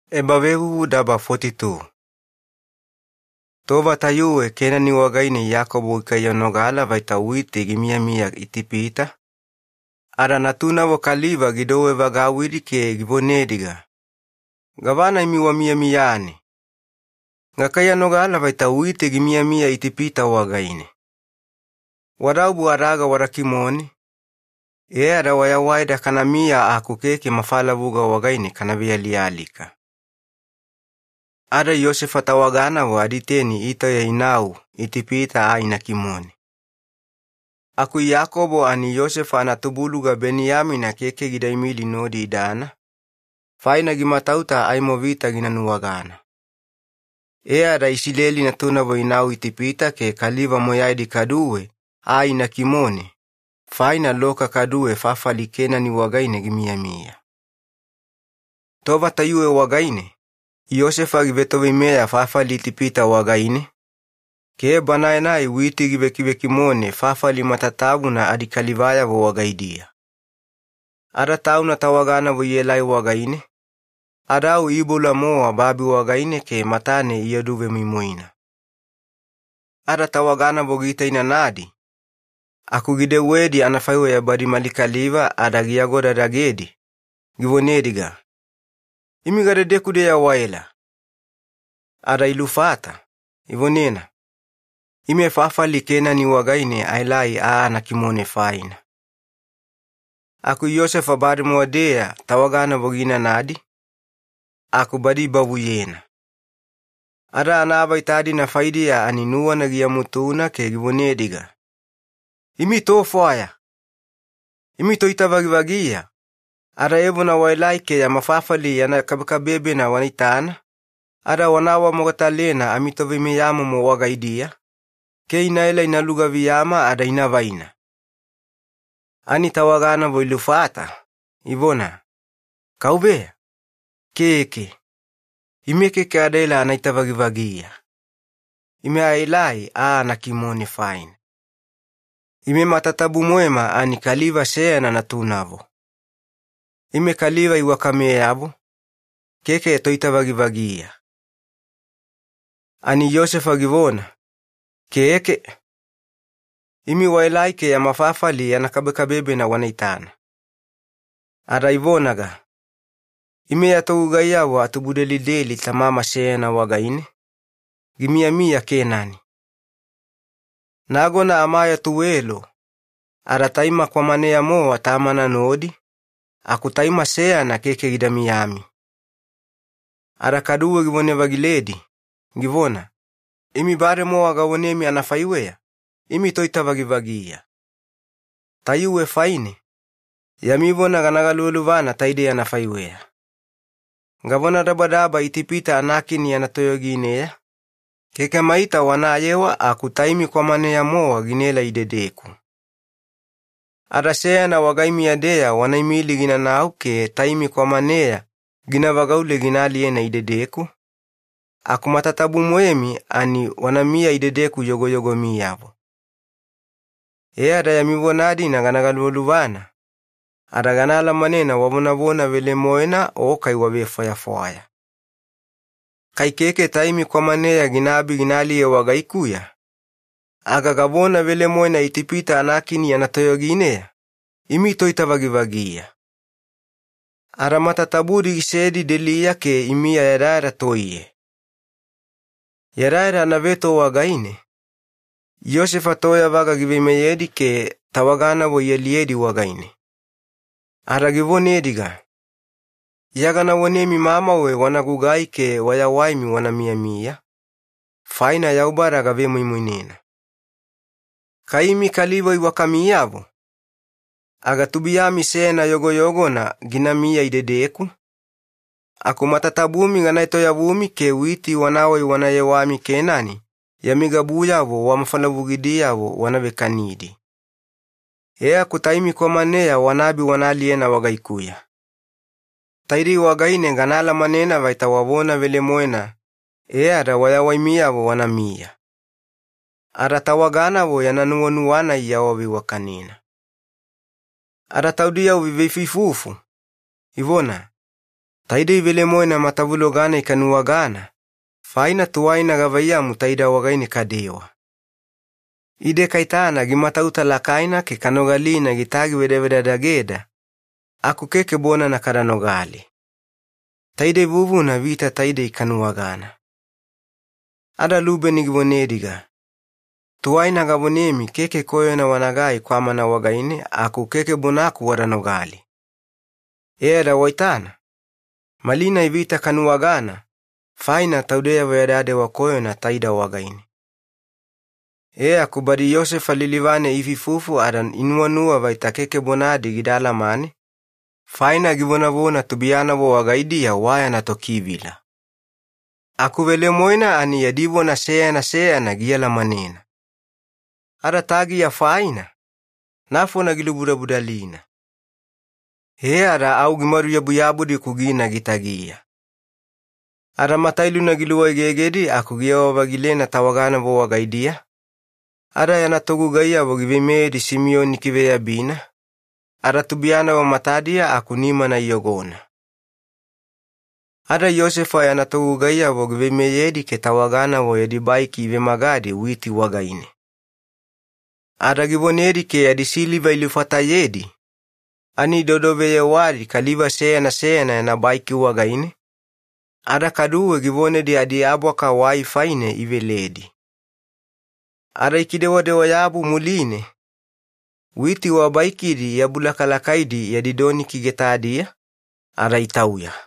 Yosefa tawaganavo inau Itipita. Tova tayuwe Kenani wagaine Iyakobo gikaiyanogala vaita witi gimiyamiya Itipita, ada natunavo kaliva gidouwe-vagauwidi ke givonediga, “Gavana imi wamiyamiyane? Ganogalina witi gimiyamiya Itipita wagaine. Wadaobu adaga wada kimone, e ada wayawaida kanamiya aku keke mafalavuga wagaine kana vealialika.” Ada Yosefa tawaganavo aditeni itauya inau Itipita aa ina kimone. Aku Iyakobo ani Yosefa anatubuluga Beniyamina keke gidaimili nodi idana, faina gimatauta aimo vita gina nuwagana. E ada Iyakobo, kaduwe anayegana Isileli, ani natunavo inau Itipita ke kaliva moyaidi kaduwe aa ina kimone, faina loka kaduwe fafali Kenani wagaine gimiyamiya. Tova tayuwe wagaine Yosefa givetoveimeya fafali Itipita wagaine ke banae-nai witi givekivekimone fafali matatabuna adikalivayavo wagaidiya. Ada tauna tawaganavo ielai wagaine ada au iiboula-mowa babi wagaine ke matane ioduvemoimoina. Ada tawaganavo giitainanadi aku gidewedi anafaiweya badi mali kaliva ada giagodadagedi, givonediga, “Imi gadedeku-deya waela?” Ada ilufata, ivonena, “Ime fafali Kenani wagaine aelai aa anakimone faina.” Aku Yosefa bademowa-deya tawaganavo giinanadi, aku badi ibavuyena. Ada anaavaita-dina faidiya ani nuwana giamutuna ke givonediga, “Imi tofwaya! Imi toitavagivagiya, ada evona waelai ke yama fafali yana kabekabebena wanaitana ada wana awamogatalena amitoveimeyamomo wagaidiya ke inaela ina lugaviyama ada inavaina!” Ani tawaganavo ilufata, ivona, “Keke, Kauveya. Ime keke adaela ana itavagivagiya, ime aelai aa anakimone faina. Ime matatabu-moema ani kaliva seyana natunavo. Ime kaliva iwakameyavo, keke toitavagivagiya.” Ani Yosefa givona, “Keke. Imi waelai ke yama fafali yana kabekabebena wanaitana.” Ada ivonaga, “Ime ya togugaiyavo atubudelideli tamama seyana wagaine gimiyamiya Kenani. Nagona amayoo tuwelo ada taima kwamaneya-mowa tamama nodi aku taima seyana keke gida miyami.” Ada kaduwe givone-vagiledi, givona, “Imi bademowa gavonemi anafaiweya, imi toitavagivagiya. Tayuwe faine yami vona gana galuvaluvana taidei anafaiweya: Gavonadabadaba Itipita anakini yana toyogineya, keke maita wanayewa aku taimi kwamaneya-mowa ginaelai idedeku. Ada seyana wagaimiya-deya wanaimili ginanau ke taimi kwamaneya gina vagaule gina aliyena idedeku, aku matatabu-moemi ani wanamiya idedeku yogoyogomiyavo, e ada yami vona-dina gana galuvaluvana ada gana alamanena wavonavona velemoena o kai wavefwayafwaya. Kai keke taimi kwamaneya ginaabi gina aliye wagaikuya aga gavona velemoena Itipita anakini yana toyogineya, imi toitavagivagiya!” Ada matatabu-moedi gisedi deliya ke imiya yadayada toiye. Yadayada anaveto wagaine Yosefa toyavaga giveimeyedi ke tawaganavo ialiyedi wagaine ada givonediga, “Iya gana vonemi mamauwe wanagugai ke wayawaimi wana miyamiya, faina Yaubada gavemoimoinena. Kai imi kaliva iwakamiyavo aga tubuiyami seyana yogoyogona ginamiya idedeku, aku matatabumi gana etoyavumi ada witi wanawai wana yewami Kenani yami gabuyavo wamafalavugidiyavo wana vekanidi. E aku taimi kwamaneya wanaabi wana aliyena wagaikuya. Taidei wagaine gana alamanena vaita wavona velemoena e ada wayawaimiyavo wanamiya.” Ada tawaganavo yana nuwanuwa-nai iawaveiwakanena. Ada ivebutu taudiyavo iifufu, ivona, “Taidei velemoena, matavuloga-nai kanuwagana faina tuwaina gavaiyamu taida wagaine kadewa. Ide kaitana gimatauta lakaina ke kanogalina gitagivedavedadageda aku keke bonana kada nogali. Taidei vuvuna vita taidei kanuwagana.” Ada Lubeni givonediga, “Tuwaina gavonemi keke koyona wanagai kwamana wagaine aku keke bonaku wada nogali. Ada waitana, malinai vita kanuwagana faina taudeyavo yada dewa koyona taida wagaine.” E aku badi Yosefa lilivane iifuifufu ada inuwanuwa vaita keke bonadi gida alamane, faina givonavona tubuiyanavo wagaidiya wayana tokivila. Aku velemoena ani yadi vona seyana seyana gialamanena. Ada tagiya faina nafona gilubudabudalina au gimaduyabuyabudi-ku gina gitagiya. E ada matailuna giluwegegedi aku giyewa-vagilena tawaganavo wagaidiya ada yana togugaiyavo giveimeyedi Simiyoni ikiveyabina ada tubuiyanavo matadiya aku nimana iyogona. Ada Yosefa yana togugaiyavo giveimeyedi ke tawaganavo yadi baiki ivemagadi witi wagaine ada givonedi ke yadi siliva ilufatayedi ani idodoveyewadi kaliva seyana seyana yana baiki wagaine, ada kaduwe givonedi adiabwaka wai faine iveledi. Ada ikidewadewa-yabu muline, witi wabaikidi iabulakalakaidi yadi doniki getadiya ada itauya.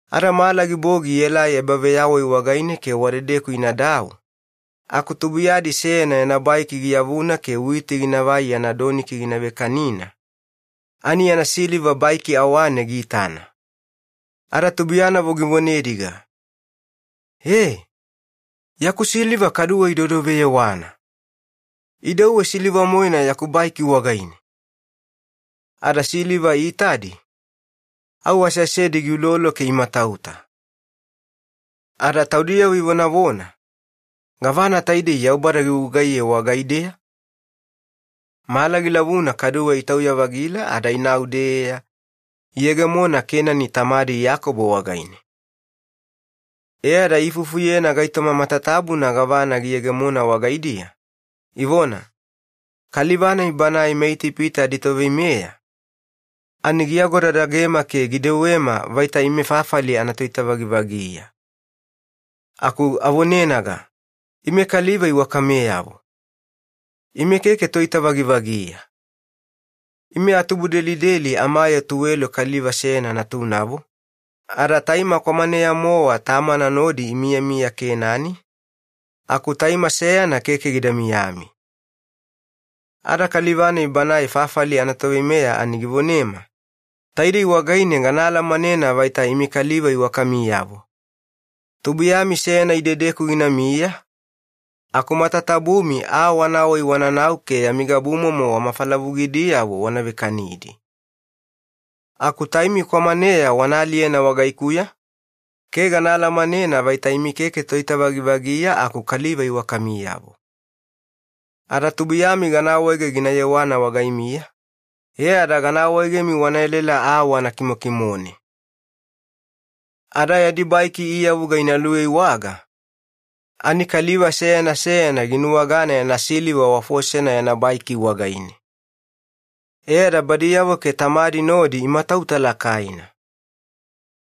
Ada mala gibogi ielai ebaveyawai wagaine ke wadedeku inadau, aku tubuiyadi seyana yana baiki giyavuna ke witi ginavai yana doniki gina vekanina ani yana siliva baiki awane giitana. Ada tubuiyanavo givonediga, “E! Yaku siliva kaduwe idodoveyewana! Idauwe siliva-moena yaku baiki wagaine!” Ada siliva iitadi, au aseasedi giulolo ke imatauta, ada taudiyavo ivonavona, “Gavana taidei Yaubada gigugaiye wagaideya?” Mala gilavuna kaduwe itauya-vagila ada inau-deya, iyegemona Kenani tamadi Iyakobo wagaine. E ada iifufuyena gaitoma matatabuna gavana giyegemona wagaidiya, ivona, “Kaliva-nai banae meItipita aditoveimeya ani giagodadagema ke gidewema vaita ime fafali anatoitavagivagiya. Aku avonenaga, ‘Ime kaliva iwakameyavo, ime keke toitavagivagiya. Ime atubudelideli amayoo tuwelo kaliva seyana natunavo, ada taima kwamaneya-mowa tamama nodi imiyamiya Kenani aku taima seyana keke gida miyami.’ “Ada kaliva-nai banae fafali anatoveimeya ani givonema, ‘Taidei wagaine gana alamanena vaita imi kaliva iwakamiyavo: tubuiyami seyana idedeku ginamiya aku matatabumi aa wanawai wananau ke yami gabumomo wamafalavugidiyavo wana vekanidi. Aku taimi kwamaneya wana aliyena wagaikuya ke gana alamanena vaita imi keke toitavagivagiya aku kaliva iwakamiyavo. Ada tubuiyami gana awaege gina yewana wagaimiya ke meyameyaganina gana awaegemi wana elaela aa wana kimokimone.’” E ada yadi baiki iiyavuga ina luiwaiwaga, ani kaliva seyana seyana ginuwagana yana siliva wafosena yana baiki wagaine, ada badiyavo ke tamadi nodi imatauta lakaina.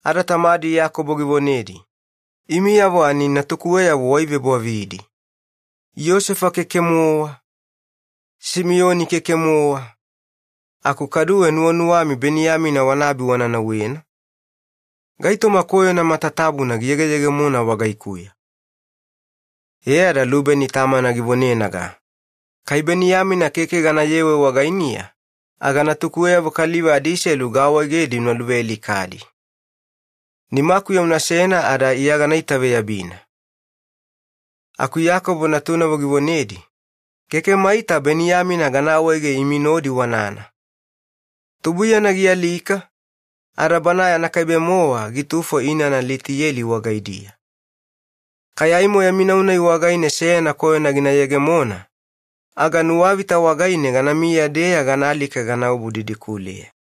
Ada tamadi Iyakobo givonedi, “Imiyavo ani natukuweyavo waivebwavidi. Yosefa keke-mowa, Simiyoni keke-mowa, aku kaduwe nuwanuwami Beniyamina wanaabi wana nauwena? Gaitoma koyona matatabuna giyegeyegemona wagaikuya!” E ada Lubeni tamana givonenaga, “Kai Beniyamina keke ganayewe wagainiya aga natukuweyavo kaliva adiselu gaawaegedi una luvealikadi. Nimakuya unasena ada iya gana itaveyabina.” Aku Iyakobo natunavo givonedi, “Keke maita Beniyamina gana awaege imi nodi wanana. Tubuiyana gialika ada banae anakaibe-mowa gitufo inana Litiyeli wagaidiya. Kai aimo yami nau-nai wagaine seyana koyona gina yegemona, aga nuwavita wagaine ganamiya-deya ganaalika ganaobu didikuleya.”